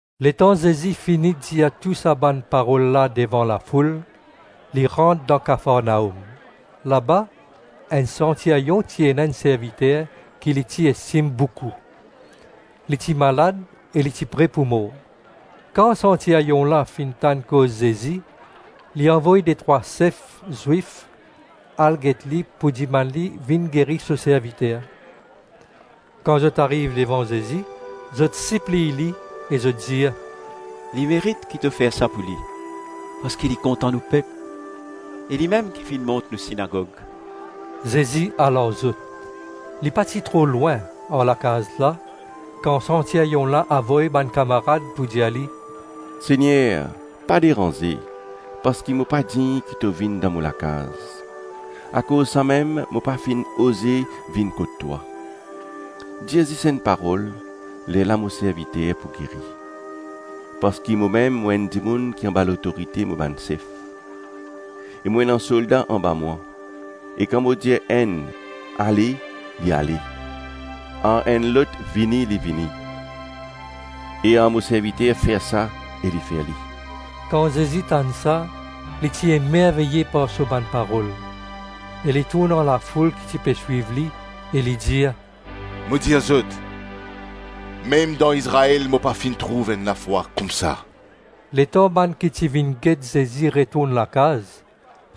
Letan Zezi fini dir tou sa bann parol la devan lafoul, li rant dan Kafarnaom. Laba, enn santiryon ti ena enn serviter ki li ti estim boukou. Li ti malad e ti pre pou mor. Kan santiryon la finn tann koz Zezi, li avoy detrwa sef Zwif al get li pou dimann li vinn geri so serviter. Kan zot ariv devan Zezi, zot sipliy li e zot dir, “Li merit ki to fer sa pou li, parski li kontan nou pep, e limem ki finn mont nou sinagog.” Zezi al ar zot. Li pa ti tro lwin ar lakaz la kan santiryon la avoy bann kamarad pou dir li, “Segner, pa deranze; parski mo pa dign ki to vinn dan mo lakaz; akoz samem mo pa finn oze vinn kot twa. Dir zis enn parol, lerla mo serviter pou geri. Parski momem mo enn dimoun ki anba lotorite mo bann sef, e mo ena solda anba mwa; e kan mo dir ar enn, ‘Ale,’ li ale; ar enn lot, ‘Vini,’ li vini; e ar mo serviter, ‘Fer sa,’ e li fer li.” Kan Zezi tann sa li ti emerveye par so bann parol, e li tourn ar lafoul ki ti pe swiv li, e li dir, “Mo dir zot, mem dan Izrael mo pa finn trouv enn lafwa koumsa.” Letan bann ki ti vinn get Zezi retourn lakaz,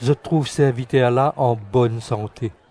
zot trouv serviter la an bonn sante.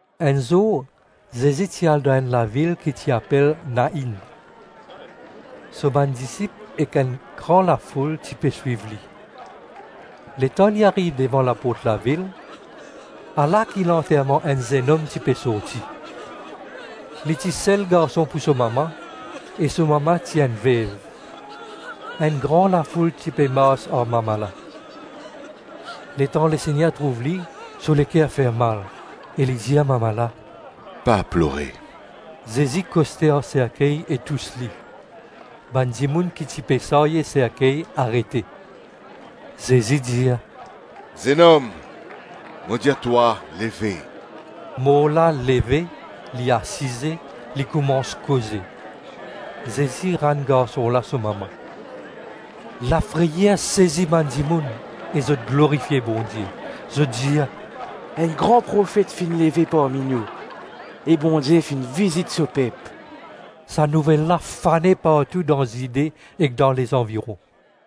Enn zour, Zezi ti al dan enn lavil ki ti apel Nainn. So bann disip ek enn gran lafoul ti pe swiv li. Letan li ariv devan laport lavil, ala ki lanterman enn zennom ti pe sorti. Li ti sel garson pou so mama, e so mama ti enn vev. Enn gran lafoul ti pe mars ar mama la. Letan Lesegner trouv li, so leker fer mal, e li dir mama la, “Pa plore.” Zezi koste ar serkey e tous li. Bann dimoun ki ti pe sarye serkey arete. Zezi dir, “Zennom, mo dir twa, leve.” Mor la leve, li asize, li koumans koze. Zezi rann garson la so mama. Lafreyer sezi bann dimoun e zot glorifie Bondie; zot dir, “Enn gran profet finn leve parmi nou e Bondie finn vizit so pep.” Sa nouvel la fane partou dan Zide ek dan lezanviron.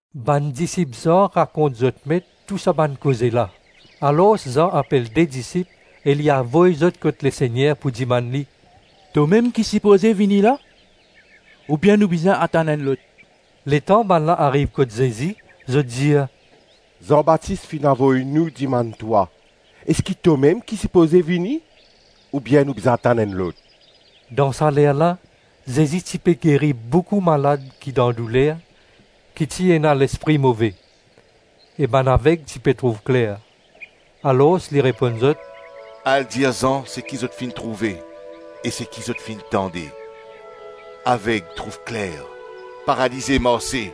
Bann disip Zan rakont zot met tou sa bann kiksoz la. Alors Zan apel de disip e li avoy zot kot Lesegner pou dimann li, “Tomem ki sipoze vini la, oubien nou bizin atann enn lot?” Letan bannla ariv kot Zezi, zot dir, “Zan Batis finn avoy nou dimann twa, ‘Eski tomem ki sipoze vini, oubien nou bizin atann enn lot?” Dan sa ler la, Zezi ti pe geri boukou malad ki dan douler, ki ti ena lespri move; e bann aveg ti pe trouv kler. Alors li reponn zot, “Al dir Zan seki zot finn trouve ek seki zot finn tande: aveg trouv kler, paralize marse,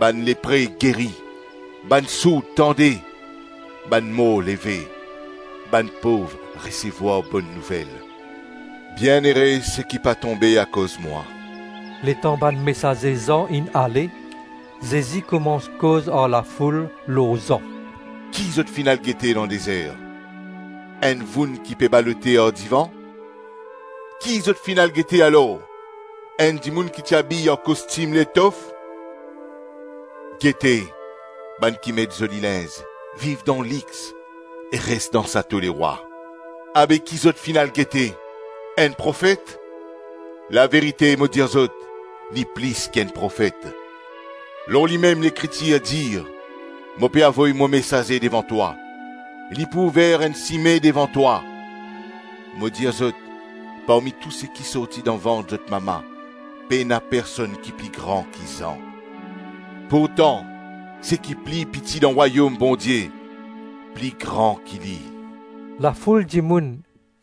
bann lepre geri, bann sourd tande, bann mor leve, bann pov resevwar Bonn Nouvel. Bienere seki pa tonbe akoz mwa.” Letan bann mesaze Zan inn ale, Zezi koumans koz ar lafoul lor Zan: “Ki zot finn al gete dan dezer? Enn voun ki pe balote ar divan? Ki zot finn al gete alor? Enn dimoun ki ti abiy ar kostim letof? Gete, bann ki met zoli linz, viv dan lix e res dan sato lerwa. Abe ki zot finn al gete? Enn profet? Laverite, mo dir zot, li plis ki enn profet. Lor limem Lekritir dir, ‘Mo pe avoy mo mesaze devan twa, li pou ouver enn sime devan twa.’ Mo dir zot, parmi tou seki sorti dan vant zot mama, pena personn ki pli gran ki Zan; pourtan seki pli piti dan Rwayom Bondie, pli gran ki li.” Lafoul dimoun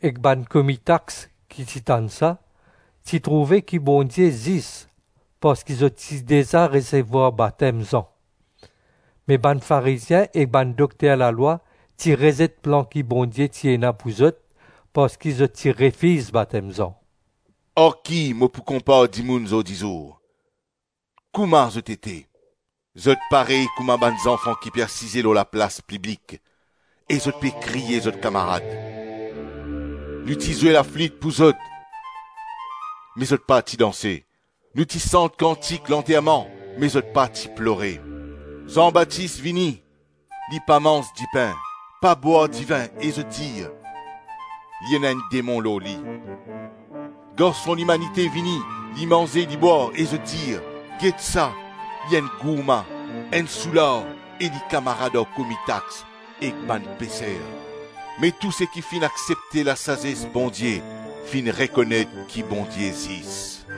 ek bann komi tax, ki ti tann sa, ti trouve ki Bondie zis parski zot ti deza resevwar batem Zan; me bann Farizien e bann dokter lalwa ti rezet plan ki Bondie ti ena pou zot parski zot ti refiz batem Zan. “Ar ki mo pou konpar dimoun zordizour? Kouma zot ete? Zot parey kouma bann zanfan ki pe asize lor laplas piblik e zot pe kriye zot kamarad: ‘Nou ti zwe laflit pou zot, me zot pa ti danse; nou ti sant kantik lanterman, me zot pa ti plore.’ Zan Batis vini, li pa manz dipin, pa bwar divin, e zot dir, ‘Li ena enn demon lor li.’ Garson Limanite vini, li manze li bwar, e zot dir, ‘Get sa, li enn gourman, enn soular e li kamarad ar komi tax ek bann peser!’ Me tou seki finn aksepte lasazes Bondie finn rekonet ki Bondie zis.”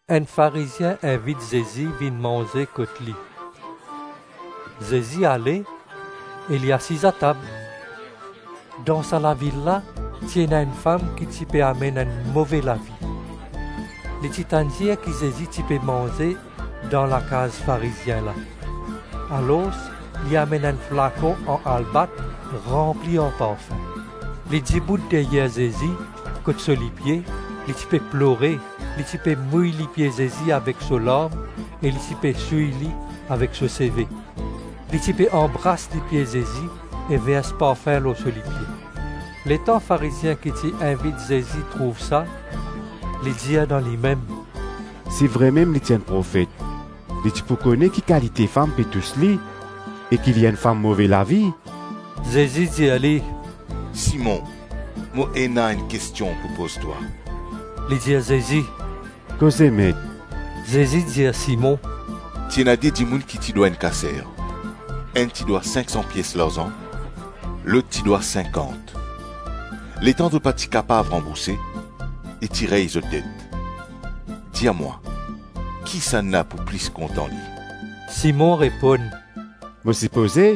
Enn Farizien invit Zezi vinn manze kot li. Zezi ale e li asiz atab. Dan sa lavil la, ti ena enn fam ki ti pe amenn enn move lavi. Li ti tann dir ki Zezi ti pe manze dan lakaz Farizien la; alors, li amenn enn flakon an albat ranpli ar parfin. Li dibout deryer Zezi, kot so lipie, li ti pe plore, li ti pe mouy lipie Zezi avek so larm e li ti pe souy li avek so seve. Li ti pe anbras lipie Zezi e vers parfin lor so lipie. Letan Farizien ki ti invit Zezi trouv sa, li dir dan limem, “Si vremem li ti enn profet li ti pou kone ki kalite fam pe tous li e ki li enn fam move lavi.” Zezi dir li, “Simon, mo ena enn kestion pou poz twa.” Li dir Zezi, “Koze Met.” Zezi dir Simon, “Ti ena de dimoun ki ti dwa enn kaser; enn ti dwa sink-san pies larzan, lot ti dwa sinkant. Letan zot pa ti kapav ranbourse, li ti rey zot det. Dir mwa, kisannla pou plis kontan li?” Simon reponn, “Mo sipoze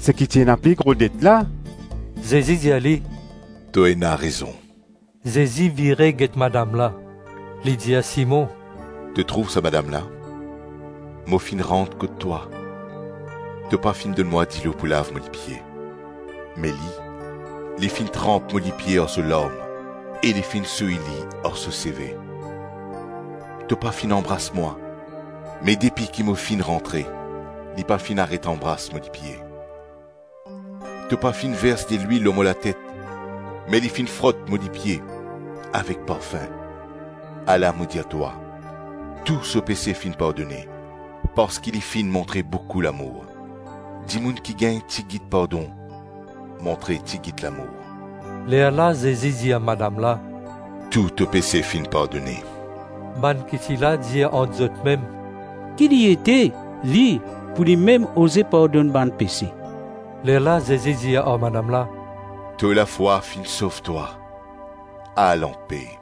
seki ti ena pli gro det la.” Zezi dir li, “To ena rezon.” Zezi vire get madam la, li dir Simon, “To trouv sa madam la? Mo finn rant kot twa, to pa finn donn mwa dilo pou lav mo lipie, me li, li finn tranp mo lipie ar so larm e li finn souy li ar so seve. To pa finn anbras mwa, me depi ki mo finn rantre, li pa finn aret anbras mo lipie. To pa finn vers delwil lor mo latet, me li finn frot mo lipie avek parfin. Ala mo dir twa, tou so pese finn pardone parski li finn montre boukou lamour. Dimoun ki gagn tigit pardon, montre tigit lamour”. Lerla Zezi dir madam la, “Tou to pese finn pardone.” Bann ki ti la dir ant zotmem, “Ki li ete li pou li mem oze pardonn bann pese?” Lerla Zezi dir ar madam la, “To lafwa finn sov twa, al anpe.”